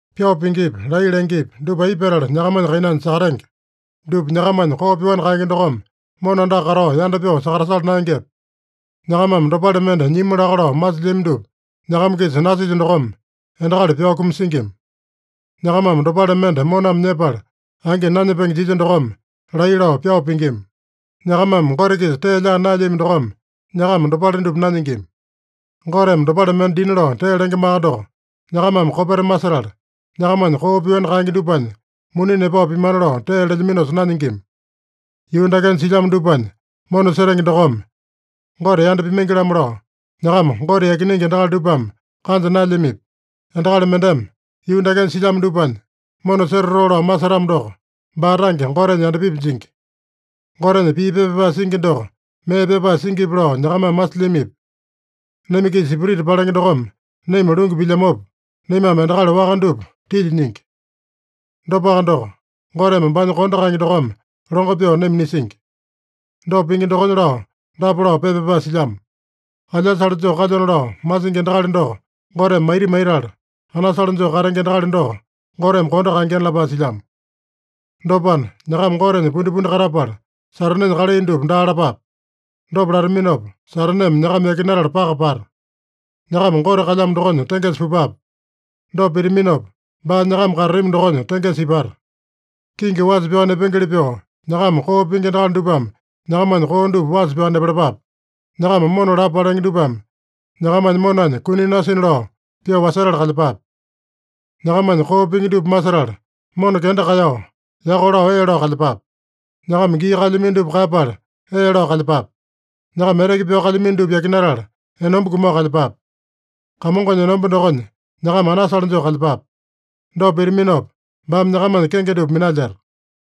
Pyao pingipi, laiya lengepi, dupa aipa petala nyakamanya kainanya sakatenge? Dupa nyakamanya koo pyoani kaenge dokome mona andaka katao yanda pyoo sakatasala naengepe? Nyakamame dopale mende nyimu laka lao masilyami dupa nyakama-kisa nasilya dokome, endakali pyao kumasingima. Nyakamame dopale mende moname nyepala, angi nanyepenge jilya dokome, laiya lao pyao pingima. Nyakamame Gote-kisa tee laa naelyami dokome, nyakama dopale dupa nanyingima. Goteme dopale mende dina lao tee lengemaka doko, nyakamame kopeta masetala, nyakamanya koo pyoani kaenge dupanya muni nepao pimana lao tee lelyaminosa nanyingima. Yuu dakenya silyamo dupanya mona setenge dokome Gote yanda pimaingi-lamo lao, nyakama Gote yakinenge endakali dupame kanja naelyamipi? Endakali mendeme yuu dakenya silyamo dupanya mona setatoo lao masetamo doko, baa tange Gotenya yandapipi jingi. Gotenya pii pepa pyapae singi doko mee pyapae singipi lao nyakamame masilyamipi? Naima-kisa spirita palenge dokome naima lungu pilyamopa, naimame endakali waka dupa tilya nyingi. Dopaka doko, Goteme baanya kondo kaenge dokome longo pyoo naima nisingi. Dopa pingi dokonya lao dapa lao pepa pyapae silyamo: “Alyasale joo kalyona lao masingi endakali doko Goteme maita maitala, anasale joo katenge endakali doko Goteme kondo kaengena” lapae silyamo. Dopana, nyakama Gotenya pundipundi katapala, Satanenya kalai dupa daa lapape. Dopa lataminopa, Sataneme nyakama yakinatala paka pata. Nyakama Gote kalyamo dokonya tengesa pupape. Dopa pitaminopa baa nyakama katatami dokonya tengesa ipata. Kingi wasa pyao nepengeli pyoo, nyakama koo pingi endakali dupame nyakamanya koo dupa wasa pyao nepalapape. Nyakama mona lapo palenge dupame nyakamanya monanya kuni nasina lao pyoo wasetala kalyepape. Nyakamanya koo pingi dupa masetala, mona kenda kaeyao, yako lao ee lao kalyepape. Nyakama gii kaelyamino dupa kaeyapala, ee lao kalyepape. Nyakama eteke pyao kalyamino dupa yakinatala, enomba kumao kalyepape. Kamongonya enomba dokonya nyakama anasale joo kalyepape. Dopa pitaminopa, baame nyakamanya kenge dupa minalyeta.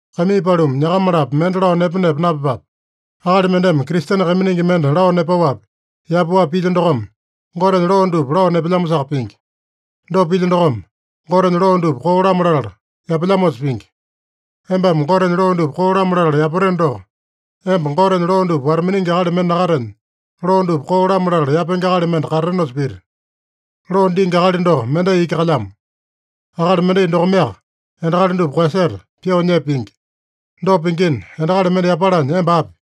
Kaimii paluma, nyakama-lapo mende lao nepa-nepa napyepape. Akali mendeme Kristene kaiminingi mende lao nepaowapi, yapaowapi pilya dokome, Gotenya loo dupa lao nepelyamosaka pingi. Dopa pilya dokome, Gotenya loo dupa koo-lamo latala yapelyamosa pingi. Embame Gotenya loo dupa koo-lamo latala yapateno doko, emba Gotenya loo dupa wata-miningi akali mende nakatenya, loo dupa koo-lamo latala yapenge akali mende katatenosa pita. Loo dingi akali doko mendai iki kalyamo. Akali mendai dokomeaka endakali dupa koeyaseta, pyoo nyepa pingi. Dopa pingina, endakali mende yapalanya emba api?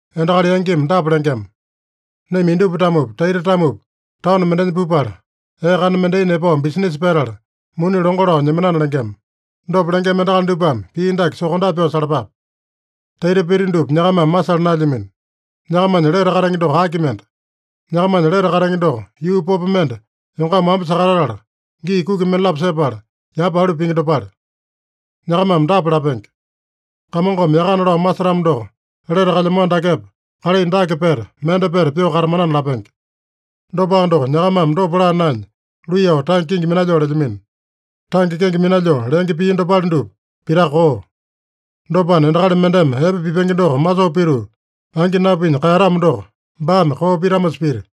Endakali yangimi dapa lengema: “Naima indupa-tamopi, taita-tamopi, taono mendenya pupala, ee kana mendai nepao bisinisa petala, muni longo lao nyemanana” lengema. Dopa lengema endakali dupame pii dake sokondape pyoo salapape: Taita pita dupa nyakamame masala naelyamino. Nyakamanya lete katenge doko aki mende? Nyakamanya lete katenge doko, yuu popo mende yongama wamba sakatatala, gii kuki mendalapo sepala, yapa alu pingi dopale. Nyakamame dapa lapenge: “Kamongome yakana lao masetamo doko, lete kalyamano dakepa kalai dake peta, mende peta pyoo katamanana” lapenge. Dopaka doko, nyakamame dopa laa naenya, luiyao tange kenge minalyoo lelyamino. Tange kenge minalyoo lenge pii dopale dupa pitaka koo. Dopana, endakali mendeme epe pipenge doko masoo pituu, angi napinya kaeyatamo doko, baame koo pitamosa pita.